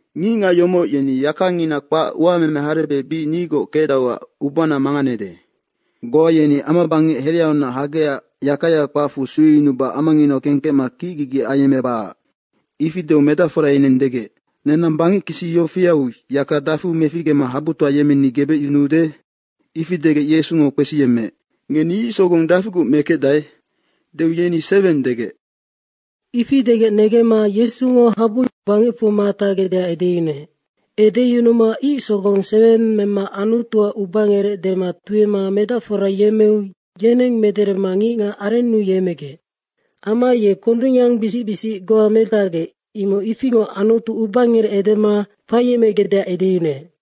“Ngicngac yomoc yeni yakangina kpac uameme harebec bic nigoc kecdauac ubana manganede. Goa yeni amabangec hereaunac hagecac yakaya kpacfu sueyunuba amanginau kengkecma kicgigi ayemmebacac.” Ifi deu medacfora yeneng degec, “Nenang bangec kisi yofiau yaka dafiu meficgema habutoa yemmeni gebecyunuude?” ifi degec Yesungo kpesiyemmeec, “Ngeni ic sogong dafiguc mekecdae?” deu yeni “Seweng” degec. Ifi degec negemma Yesungo habu bangecfu matacgecdeac edeyunuec. Edeyunuma ic sogong seweng mema Anutuac ubangerec dema tuema medacfora yemmeu yeneng mederema ngicngac arennu yemmegec. Amma ye kondungyangbisic bisic goa metacgecmoc, imoc ifingoc Anutu ubangerec edema faiyemmegecdeac edeyunuec.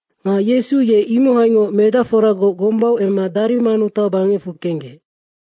Nga Yesu ye imohaingoc medacforagoc gombau emma Darimanuta bangecfu kenggec.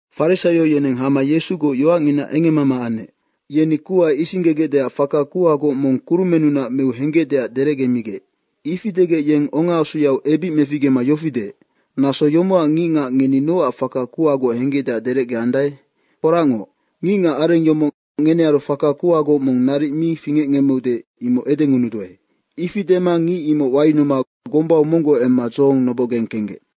Farisaio yeneng hama Yesugoc yoacngina engemmama anec. Yeni kuha isinggegecdeac faka kuhagoc mong kurumennunac meu henggecdeac derecgemigec. Ifi degec yeng ongaasuyau ebic meficgema yofi deec, “Naso yomocac ngicngac ngeni nocac faka kuhagoc henggecdeac derecgeandae? Foracngoc, ngicngacareng yomoc ngenearu faka kuhagoc mong naric mi fingecngemmeude, imoc edengunuduae.” Ifi dema ngic imoc wayunuma gombau monggoc emma dzohong nobocgeng kenggec.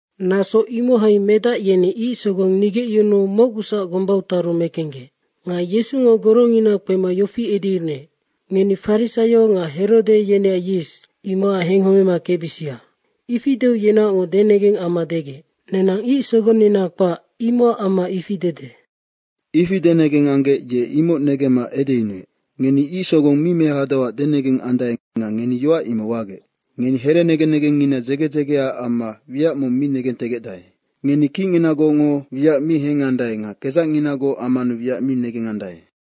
Naso imohai medac yeni ic sogong nigecyunuu mocgusac gombau taru mekenggec. Nga Yesungo gorongina kpema yofi edeyunuec, “Ngeni farisaio nga Herode yeneac yis, imocac henghomema kecbisia.” ifi deu yenaocngoc denegeng amma degec, “Nenang ic sogonnina kpac, imocac amma ifi dede.” Ifi denegeng anggec ye imoc negemma edeyunuec, “Ngeni ic sogong mi mehadauac denegeng andae nga ngeni yoac imoc wagec. Ngeni herenegen negengngina dzege dzegeaac amma wiac mong mi negentegecdae. Ngeni kicnginagocngo wiac mi hengandae nga kedzacnginagoc ammanu wiac mi negengandae.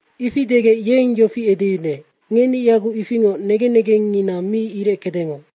Ifi degec yeng yofi edeyunuec, “Ngeni yaguc ifingoc negen negengngina mi ireckedengoc.”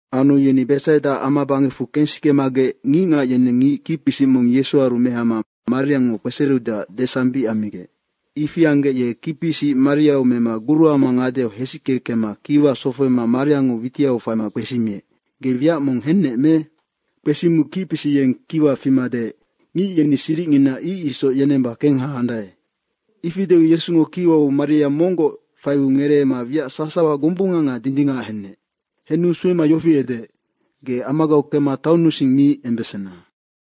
Anu yeni Betsaida amabangecfu kensikemagec ngicngac yeneng ngic kicpisic mong Yesuaru mehama mariango kpesereudeac desambic ammigec. Ifi anggec ye kicpisic mariau mema guruama ngadeau hesicke kemma kiwau sofohoma mariango witiau faima kpesimiec, “Ge wiac mong hennec me?” Kpesimiu kicpisic yeng kic fima deec, “Ngic yeni siricngina ic isoc yenemba kengha andae.” Ifi deu Yesungo kiwau maria monggoc faiu ngereema wiac sasawa gombunga nga dindingac henec. Henu suema yofi edeec, “Ge amagau kemma taonnusing mi embesena.”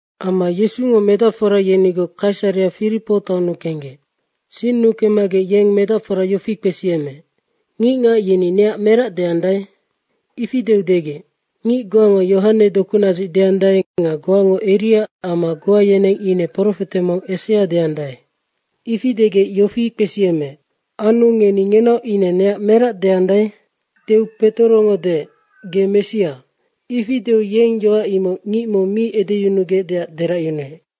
Amma Yesungo medacfora yenigoc Kaisarea Firipo taonnu kenggec. Sinnu kemmagec yeng medacfora yofi kpesiyemmeec, “Ngicngac yeni neac merac deandae?” Ifi deu degec, “Ngic goango Yohane dokunadzic deandae nga goango Eria amma goa yeneng ine profete mong esea deandae.” Ifi degec yofi kpesiyemmeec, “Anu ngeni ngenaoc ine neac merac deandae?” deu Petorongo deec, “Ge Messia.” Ifi deu yeng yoac imoc ngic mong mi edeyunugecdeac deracyunuec.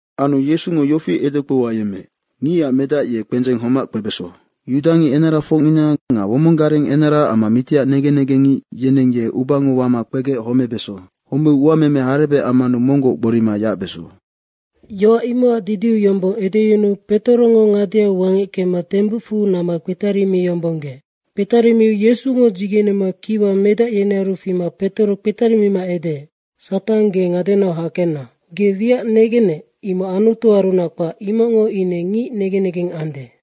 Anu Yesungo yofi edekpou ayemmeec, “Ngicac Medac ye kpendzeng homac kpebeso. Yudangic enarafocngina nga womong gareng enara amma mitiac negen negengngic yeneng ye ubango wama kpegec homebeso. Homeu uameme harebec ammanu monggoc gborima yacbeso.” Yoac imocac didiu yombong edeyunuu Petorongo ngadeau wangec kemma tembucfu namma kpetarimiyombonggeec. Kpetarimiu Yesungo dzigenema kiwa medac yenearu fima Petoro kpetarimima edeec, “Satang, ge ngadenau hakenna. Ge wiac negennec, imoc Anutuarunac kpac, imocngo ine ngicac negen negeng ande.”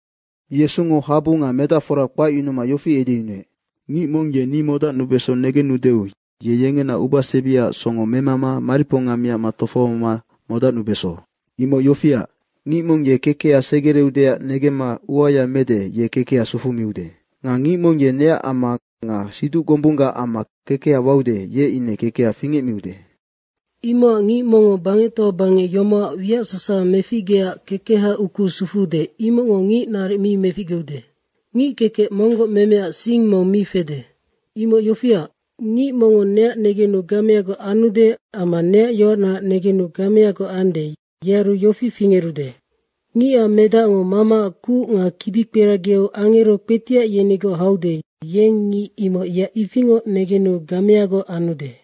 Yesungo habu nga medacfora kpacyunuma yofi edeyunuec, “Ngic mong ye ni modacnubeso negendeu ye yengena ubasebiaac songo memama mariponga miacma tofohoma modacnubeso. Imoc yofiac, ngic mong ye kekeha segereudeac negemma uaya mede, ye kekeha sufumiude. Nga ngic mong ye neac amma nga siduc gombunggac amma kekeha waude, ye ine kekeha fingecmiude. Imocac ngic mongngo bangectoa bangec yomocac wiac sasawa meficgeecac kekeha ukuu sufuude, imocngo ngic naric mi meficgeude. Ngickekec monggoc memeaac sing mong mi fede. Imoc yofiac, ngic mongngo neac negenu gameagoc anude amma neac yoacnaac negenu gameagoc ande, yearu yofi fingerude, Ngicac Medacngo Mamaac kuc nga kibikperagiau angero kpetiac yenigoc haude, yeng ngic imoc yeac ifingoc negenu gameagoc anude.”